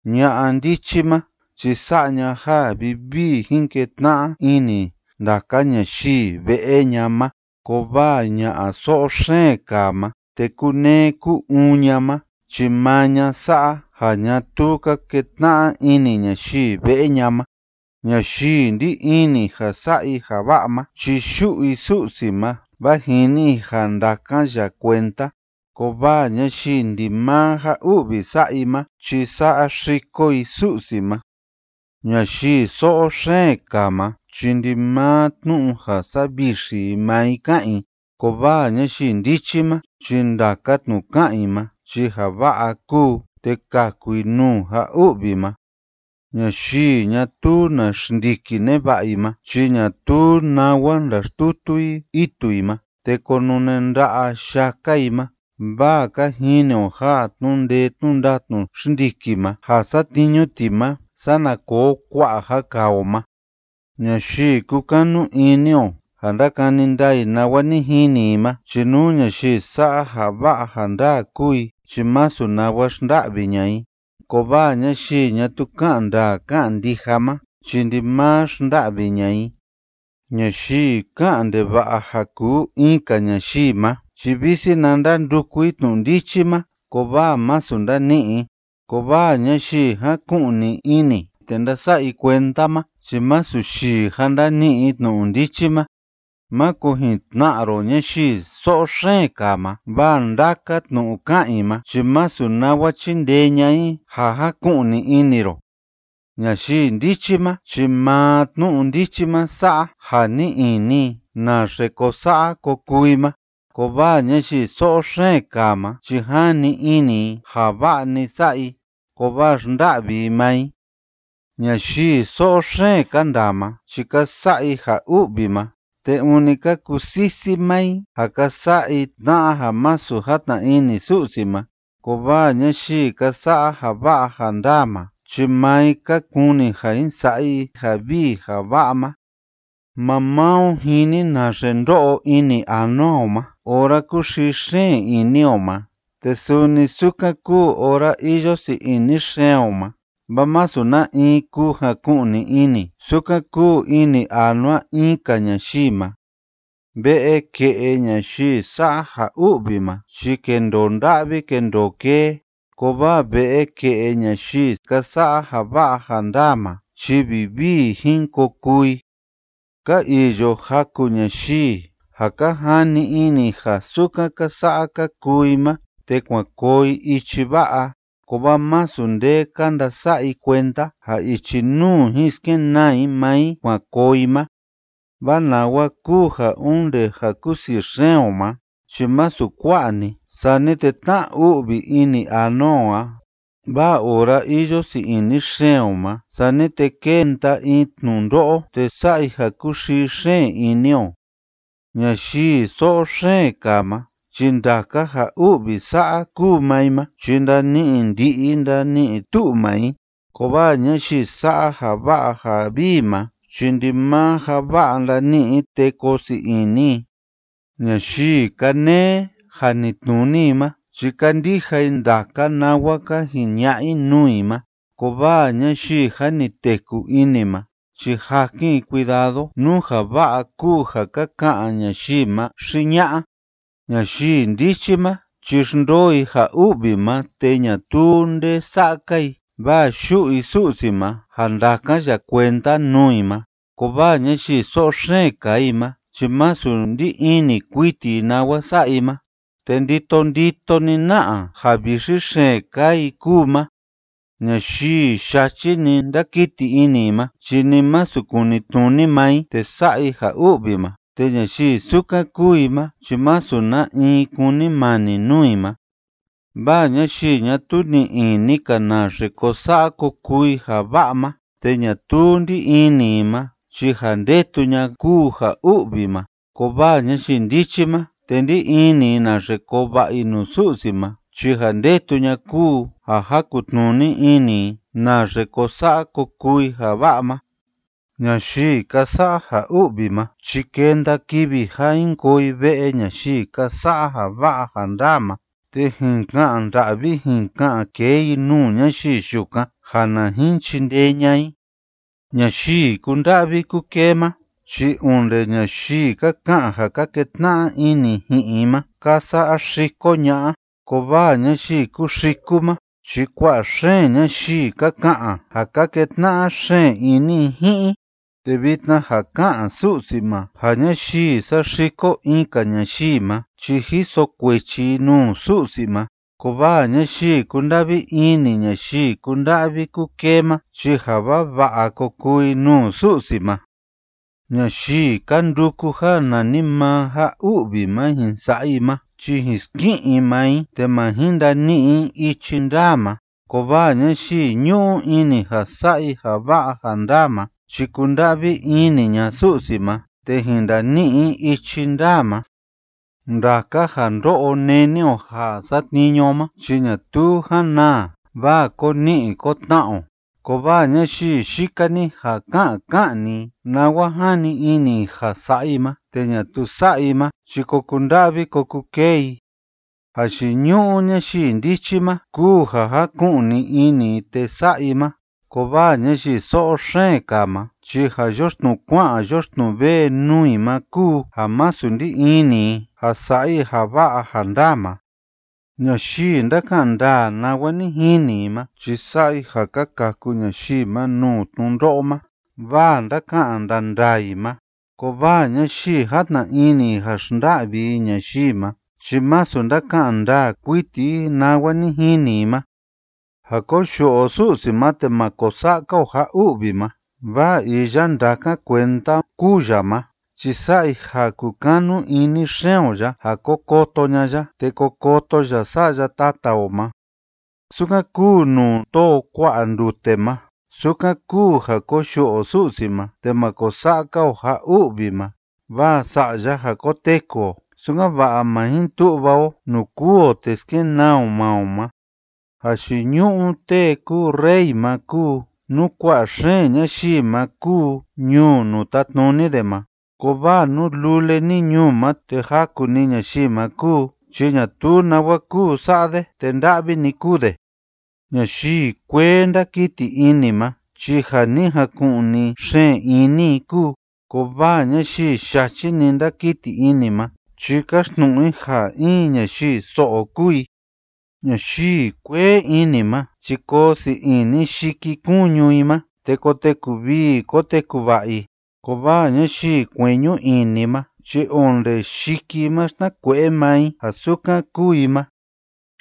Ña'a ndichi ma chi sa'a ña ja vivii jin ketna'a ini ndaka ñayii ve'e ña ma, kovaa ña'a so'o xeen kaa ma te kúnee kú‑uun ña ma chi maa ña sa'a ja ñatuu ka ketna'a ini ñayii ve'e ña ma. Ñayii ndí ini ja sa'a i ja va'a ma chi yu'u i Su'si ma vaa jini i ja ndakan ya kuenda, kovaa ñayii ndimaa ja u'vi sa'a i ma chi saxiko i Su'si ma. Ñayii so'o xeen kaa ma chi ndimaa tnu'u ja savixi i maa i ká'an i, kovaa ñayii ndichi ma chi ndaka tnu'u ká'an i ma chi ja va'a kúu, te kaku i nuu ja u'vi ma. Ñayii ñatuu na xndiki neva'a i ma chi ñatuu nawa ndaxtutu i itu i ma, te konune nda'a yaka i ma, vaa ka jini o ja tnu'u ndee tnu'u ndatnu xndiki ma ja satniñu ti ma sana koo kua'a ja kaa o ma. Ñayii kúkanu ini o ja ndakani ndaa i nawa ni jini i ma chi nú ñayii sa'a ja va'a ja ndaa kúu i chi masu nawa xnda'vi ña'a i, kovaa ñayii ñatuu ká'an ndaa ká'an ndija ma chi ndimaa xnda'vi ña'a i. Ñayii ká'an ndeva'a ja kuu in‑ka ñayii ma chi visi na ndanduku i tnu'u ndichi ma, kovaa masu ndani'i i, kovaa ñayii jáku'ni ini te ndása'a i kuenda ma chi masu yii ja ndani'i i tnu'u ndichi ma. Máko jin tna'a ro ñayii so'o xeen kaa ma, vaa ndaka tnu'u ká'an i ma chi masu nawa chíndee ña'a i ja jaku'ni ini ro. Ñayii ndichi ma chi maa tnu'u ndichi ma sa'a ja ni'i ini i naxe ko sa'a ko kuu i ma, kovaa ñayii so'o xeen kaa ma chi jani ini i ja va'a‑ni sa'a i, kovaa xnda'vi i maa i. Ñayii so'o xeen ka ndaa ma chi ka sa'a i ja u'vi ma, te ûni ka kusisi maa i ja ka sa'a i tna'a ja masu játna ini Su'si ma, kovaa ñayii ka sa'a ja va'a ja ndaa ma chi maa i ka kuni ja jin sa'a i ja vii ja va'a ma. Maa maa o jini naxe ndo'o ini anua o ma ora kúxii xeen ini o ma, te suni sukan kúu ora iyo sii ini xeen o ma, vaa masu na in kuu jaku'ni ini sukan kúu ini anua in‑ka ñayii ma. Ve'e ke'e ñayii sa'a ja u'vi ma chi kendoo nda'vi kendoo kee, kovaa ve'e ke'e ñayii ka sa'a ja va'a ja ndaa ma chi vivii jin ko kuu i. Ka iyo jaku ñayii ja ka jani ini i ja sukan ka sa'a ka kuu i ma te kuan koo i ichi va'a, kovaa masu nde ka ndasa'a i kuenda ja ichi nuu jin skenaa i maa i kuan koo i ma, vaa nawa kúu ja onde ja kusii xeen o ma chi masu kua'a‑ni sani te tna‑u'vi ini anua o a, vaa ora iyo sii ini xeen o ma sani te kénda in tnundo'o te sa'a i ja kúxii xeen ini o. Ñayii so'o xeen kaa ma chi ndaka ja u'vi sa'a kuu maa i ma chi ndani'i ndi'i ndani'i tu'u maa i, kovaa ñayii sa'a ja va'a ja vii ma chi ndimaa ja va'a ndani'i i te koo sii ini i. Ñayii kánee janitnuni i ma chi kándija i ndaka nawa ka jiña'a i nuu i ma, kovaa ñayii jâ ni teku ini ma chi jakin i cuidado nú ja va'a kúu ja ka ka'an ñayii ma xi ña'a. Ñayii ndichi ma chi xndoo i ja u'vi ma te ñatuu nde sa'a‑ka i, vaa yu'u i Su'si ma ja ndakan ya kuenda nuu i ma, kovaa ñayii so'o xeen kaa i ma chi masu ndí ini kuiti i nawa sa'a i ma, te ndito ndito‑ni na'a ja vixi xeen kaa i kúu ma. Ñayii yachi‑ni ndákiti ini i ma chi ni masu kunitnuni maa i te sa'a i ja u'vi ma, te ñayii sukan kúu i ma chi masu na in kúnimani nuu i ma, vaa ñayii ñatuu ni'i ini‑ka naxe ko sa'a ko kuu i ja va'a ma te ñatuu ndí ini i ma, chi ja ndetu ña'a kúu ja u'vi ma, kovaa ñayii ndichi ma te ndí ini i naxe koo va'a i nuu Su'si ma chi ja ndetu ña'a kúu ja jakun‑tnuni ini i naxe ko sa'a ko kuu i ja va'a ma. Ñayii ka sa'a ja u'vi ma chi kenda kivi ja jin koo i ve'e ñayii ka sa'a ja va'a ja ndaa ma, te jin ka'an nda'vi jin ka'an kee i nuu ñayii yukan ja na jin chindee ña'a i. Ñayii kúnda'vi kúkee ma chi onde ñayii ka ka'an ja ka ketna'a ini ji'in i ma ka saxiko ña'a, kovaa ñayii kúxiku ma chi kua'a xeen ñayii ka ka'an ja ka ketna'a xeen ini i ji'in i, te vitna ja ká'an Su'si ma ja ñayii saxiko in‑ka ñayii ma chi jiso kuechi i nuu Su'si ma, kovaa ñayii kúnda'vi ini ñayii kúnda'vi kúkee ma chi ja vava'a ko kuu i nuu Su'si ma. Ñayii ka nduku ja nanimaa ja u'vi ma jin sa'a i ma chi jin ski'in i maa i te ma jin ndani'i i ichi ndaa ma, kovaa ñayii ñu'u ini ja sa'a i ja va'a ja ndaa ma chi kunda'vi ini ña'a Su'si ma te jin ndani'i i ichi ndaa ma. Ndaka ja ndó'o néni o ja satniñu o ma chi ñatuu jan naa, vaa ko ni'i ko tna'a o, kovaa ñayii yika‑ni ja ká'an ká'an‑ni i nawa jani ini i ja sa'a i ma te ñatuu sa'a i ma chi ko kunda'vi ko kukee i. Jayiñu'u ñayii ndichi ma kúu ja jáku'ni ini i te sa'a i ma, kovaa ñayii so'o xeen kaa ma chi ja yoxtnuu kua'an yoxtnuu vee nuu i ma kúu ja masu ndí ini i ja sa'a i ja va'a ja ndaa ma. Ñayii ndáka'an ndaa nawa ni jini i ma chi sa'a i ja ka kaku ñayii ma nuu tnundo'o ma, vaa ndáka'an ndaa ndaa i ma, kovaa ñayii játna ini ja xnda'vi i ñayii ma chi masu ndáka'an ndaa kuiti i nawa ni jini i ma. Ja koyu'u o Su'si ma te ma ko sa'a‑ka o ja u'vi ma vaa iya ndakan kuenda kúu ya ma chi sa'a i ja kukanu ini xeen o ya ja ko koto ña'a ya te ko koto ya sa'ya tata o ma. Sukan kúu nuu tóo kua'a ndute ma, sukan kúu ja koyu'u o Su'si ma te ma ko sa'a‑ka o ja u'vi ma, vaa sa'a ya ja koteku o, sukan‑va'a ma jin tu'va o nuu kûu o te skenaa o maa o ma. Jayiñu'u tee kúu rey ma kúu nú kua'a xeen ñayii ma kúu ñuu nuu tátnuni de ma, kovaa nú lule‑ni ñuu ma te jaku‑ni ñayii ma kúu chi ñatuu nawa kúu sa'a de te nda'vi‑ni kúu de. Ñayii kuee ndákiti ini ma chi ja ni jaku'ni xeen ini i kúu, kovaa ñayii yachi‑ni ndákiti ini ma chi káxtnu'u i ja in ñayii so'o kúu i. Ñayii kuee ini ma chi koo sii ini yikikuñu i ma, te koteku vii koteku va'a i, kovaa ñayii kueñu ini ma chi onde yiki i ma xtnakue'e maa i, ja sukan kúu i ma.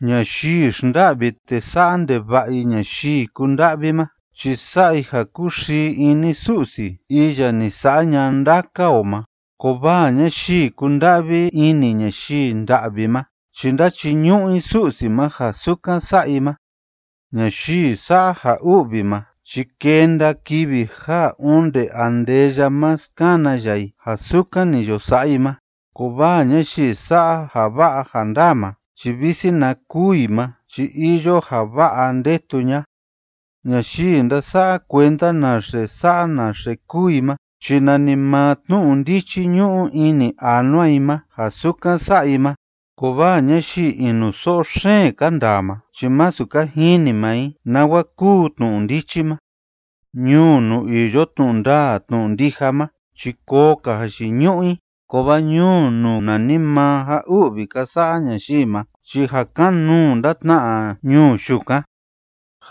Ñayii xnda'vi te sa'a ndeva'a i ñayii kúnda'vi ma chi sa'a i ja kúxii ini Su'si iya ni sa'a ña'a ndaka o ma, kovaa ñayii kúnda'vi ini ñayii nda'vi ma chi ndáchiñu'u i Su'si ma ja sukan sa'a i ma. Ñayii sa'a ja u'vi ma chi kenda kivi ja onde andeya ma skana ya i ja sukan ni yo sa'a i ma, kovaa ñayii sa'a ja va'a ja ndaa ma chi visi na kûu i ma chi iyo ja va'a ndetu ña'a. Ñayii ndasa'a kuenda naxe sa'a naxe kúu i ma chi nanimaa tnu'u ndichi ñu'u ini anua i ma ja sukan sa'a i ma, kovaa ñayii inuso'o xeen ka ndaa ma chi masu ka jini maa i nawa kúu tnu'u ndichi ma. Ñuu nuu iyo tnu'u ndaa tnu'u ndija ma chi koo‑ka jayiñu'u i, kovaa ñuu nuu nanimaa ja u'vi ka sa'a ñayii ma chi ja kan‑nuu ndatna'a ñuu yukan.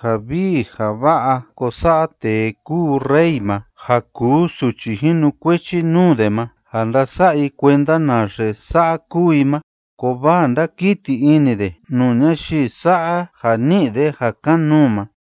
Ja vii ja va'a ko sa'a tee kúu rey ma ja kuu suchi jinukuechi nuu de ma ja ndása'a i kuenda naxe sa'a kúu i ma, kovaa ndakiti ini de nuu ñayii sa'a ja ni'i de ja kan‑nuu ma.